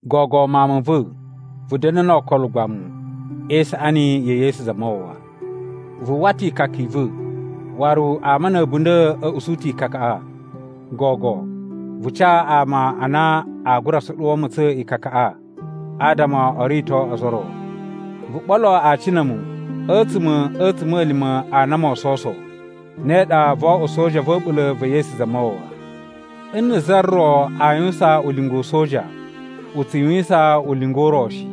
Gogo mawun ma va̱, vu da̱na̱ no okolo ugbamu e isaꞌani ya̱ Yesu Zamawawa. Vu uwwa ta̱ ikaka i va̱, waru ama na̱ a̱bunda̱ a̱ usu ta̱ ikakaꞌa. Gogo, vu ca ama a na a gura soɗuwo ma̱tsa̱n ikakaꞌa adama o rito ozo o ro. Vu ɓolo aci na̱ a̱mu a̱tsuma̱ a̱ a̱tsuma̱lima̱ a na moo sowuso, ne ɗa voo oꞌwo soja va̱ a̱ɓula̱ va̱ Yesu Zamawawa. Nna̱ za ro aa yuwusan ulinga u soja, u tsu yuwisan ulinga u ro shi.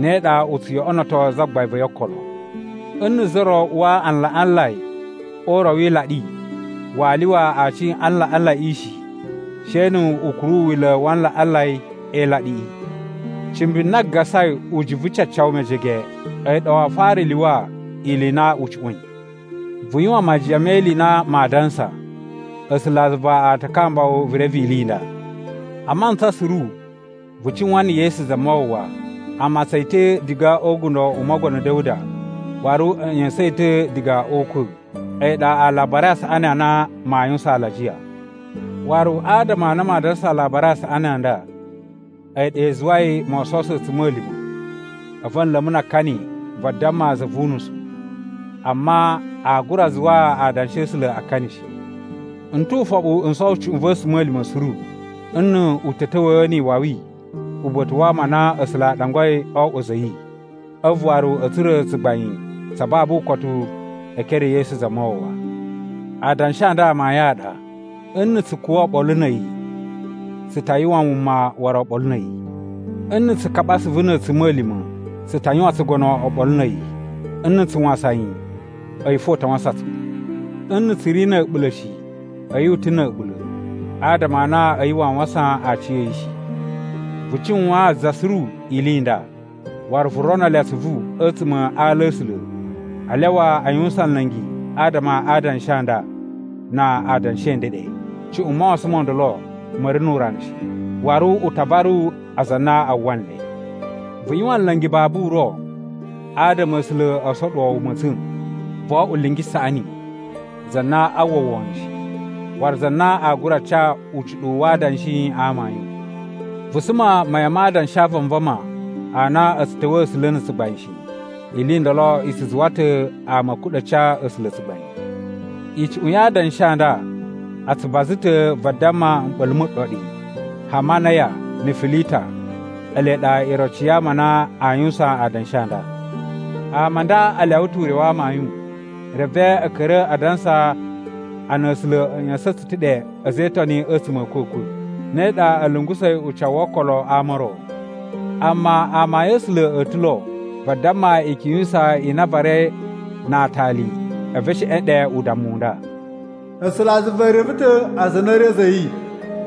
Ne ɗa u tsu yoꞌonoto zagbain va̱ yi okolo. Nna̱ za ro uwa alaꞌanlai o uro wi ilaɗi, waa lyuwa aci a alaꞌanlaiꞌi shi, she nu u kuru wila̱ wa alaꞌanlai e ilaɗiꞌi. Cimbi na gasai ujuvu cacawu mejege a̱yi ɗa waa fara lyuwa ili i na u cuꞌwa̱in. Vu yuwan majiyan me ili i na maa dansa. A̱sulazuva a ta kamba wu vu reve ili i nda. A mantsa suru vu cuwan na̱ Yesu Zamawawa. A matsan yi ta̱ diga o ugundo u Mogono Da̱wuda waru a̱ ꞌya̱sa̱n yi ta̱ diga o ukwa̱. A̱yi ɗa Alabari a Saꞌani a na maa yuwusan alajiya. Waru adama a na maa dansa Alabari a Saꞌani a nda, a̱yi ɗa i zuwai moo sowuso a̱tsuma̱lima̱ a̱vu a̱ nla̱ mu na akani vadamma za vu unusu. Amma aa gura zuwaa adanshi a̱ A̱sula̱ akani shi. N tu ufoɓu n sowo cuꞌun va̱ a̱tsuma̱lima̱ suru, nnu u ta̱ ta̱wa̱a̱ ni iwawi uba̱ta̱ wa ama a na A̱sula̱ a ɗangwai o oꞌwo a̱za̱ a̱ yi, a̱vu waru a̱ tsura̱ tsugbain tsa babu ukotu e ekere e Yesu Zamawawa. Adanshi a nda amayun a ɗa: Nna̱ tsu kuwa̱ oɓolo na̱ a̱yi, tsu ta yuwan wuma waru oɓolo na̱ a̱yi. Nna̱ tsu kaɓa asuvu na̱ a̱tsuma̱lima̱, tsu ta yuwan tsugono oɓolo na̱ a̱yi. Nna̱ tsu wasan yi, a̱yi fo u ta wasan tsu. Nna̱ tsu ri na̱ a̱ɓula̱ shi, a̱yi u ta̱ na̱ a̱ɓula̱, adama a na a̱yi waa wasan aciya̱yi shi. Vu cuwaan za suru ili i nda, waru vu rono le atsuvu a̱tsuma̱ a ala a̱ A̱sula̱ a lyawa a yuwusan nla̱ngi adama a adanshi a nda na adanshi a̱ ndeɗe. Cuꞌun mawasan mo ndolo ma̱ ri nu urana shi, waru u ta varu aza a na a uwwa nle. Vu yuwan ulinga babu uro adama A̱sula̱ o soɗuwo wu ma̱tsa̱n. Vo oꞌwo lingi saꞌani, za na a uwwa wono shi, waru za na aa gura ca ucuɗuwu wa adanshi a amayun. Vu suma mayan ma adanshi a vanvama a na a̱ tsu ta̱wa̱a̱ A̱sula̱ na̱ tsugbain shi. Ili i ndolo i tsu zuwa ta̱ ama a̱ kuɗa̱ ca A̱sula̱ tsugbain. Icuꞌun ya adanshi a nda a tsu baza ta̱ vadamma mɓa̱la̱ mu ɗoɗi. Hamanaya na̱ Filita ele ɗa iroci ya ama a na aa yuwusan adanshi a nda. Ama a nda a lyawa ta̱ ure wa amayun, reve a̱ ka̱ra̱ a dansa a na A̱sula̱ a̱ ꞌya̱sa̱n tsu ta̱ ɗe a̱za̱ e Itoni a̱tsuma̱ a̱ a̱kwa̱kwa̱, ne ɗa a̱ lungusa̱i ucawu wo okolo a ama o ro. Amma amayun a̱ A̱sula̱ a̱ ta̱ lo vadamma ikyun yu usaa i na a varai na aatali a̱vu e sheꞌen ɗe udammu u nda: “A̱sulazuva e reve ta̱ aza a na a̱ ri a̱za̱ a̱ yi,”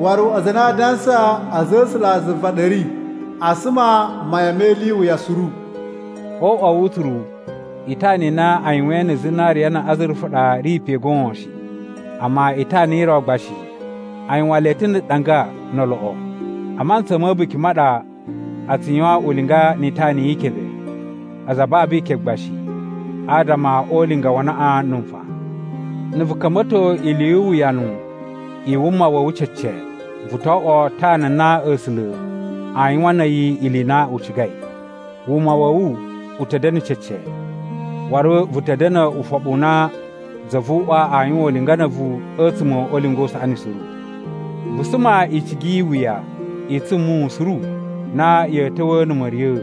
waru “Aza a na a adansa a̱za̱ a̱ A̱sulazuva a ɗa a̱ ri, a suma mayan me ili i wuya suru.” O uꞌwa wu utsuru, itana i na a yuwain na̱ zinariya na̱ azurufa ɗa ri pe goon shi, amma itana i ro gba shi a yuwan le ta̱ na̱ ɗanga no oloꞌo. A mantsa ma̱ a̱buki ma ɗa a tsu yuwan ulinga ni itana yi ikebe, aza a babu ikebe gba shi adama o ulinga wa anaꞌan na̱ nfaꞌan. Na̱ vu ka̱mba̱to ili yu uwuyanu i wuma wa̱ wu cece, vu to oꞌwo tana na A̱sula̱ aa yuwan na̱ a̱yi ili i na u cigai. Wuma wa̱ wu u ta̱ da̱na̱ cece, waru vu ta̱ da̱na̱ ufoɓu u na Zavuꞌwa aa yuwan ulinga na̱ a̱vu a̱tsuma̱ o ulinga u saꞌani suru. Vu suma icigi yi iwuya i tsumuwun suru na ya̱ ta̱wa̱a̱ na̱ ma̱riya̱a̱.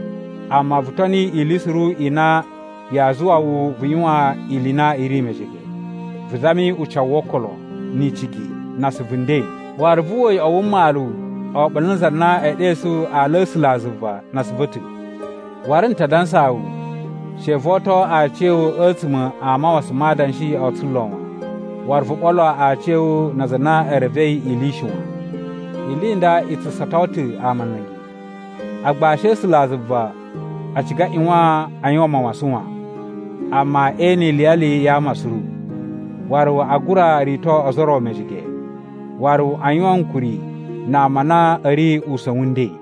Amma vu toni ili suru i na yaa zuwa wu vu yuwan ili i na i ri mejege. Vu zami ucawu wo okolo, ni icigi, na asuvu nden, waru vu uwwa uyoꞌo wu mmalu oɓolo na aza a na ee ɗesu ala a̱ A̱sulazuva na asuvu a̱ ta̱. Waru, n ta dansaa wu, she vo oto aciya̱wu a̱tsuma̱ a mawasan ma adanshi o tsulo wan, waru vu ɓolo aciya̱wu na aza a na e revei ili shi wan. Ili i nda i tsu sato ta̱ ama nla̱ngi. Agbashi a̱ A̱sulazuva a ciga a ꞌyuwan a yuwan mawasan wan, amma e ene iliyali ya ama suru. Waru a gura rito ozo o ro mejege, waru a yuwan ankuri na ama a na a̱ ri usa̱n wu nden.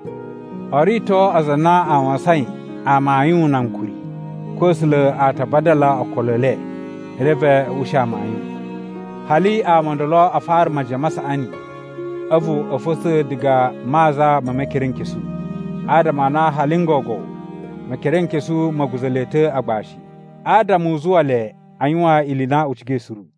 O rito aza a na a wasain amayun na ankuri. Ko A̱sula̱ a ta vadala okolo e le, reve a̱ ushi amayun. Hali ama o ndolo a fara majiyan ma saꞌani a̱vu a̱ fa̱tsa̱ diga a maza me Mekerenkesu. Adama a na hali n gogo Mekerenkesu ma̱ guza̱ le ta̱ agbashi, adama u zuwa le a yuwan ili i na u cigai suru.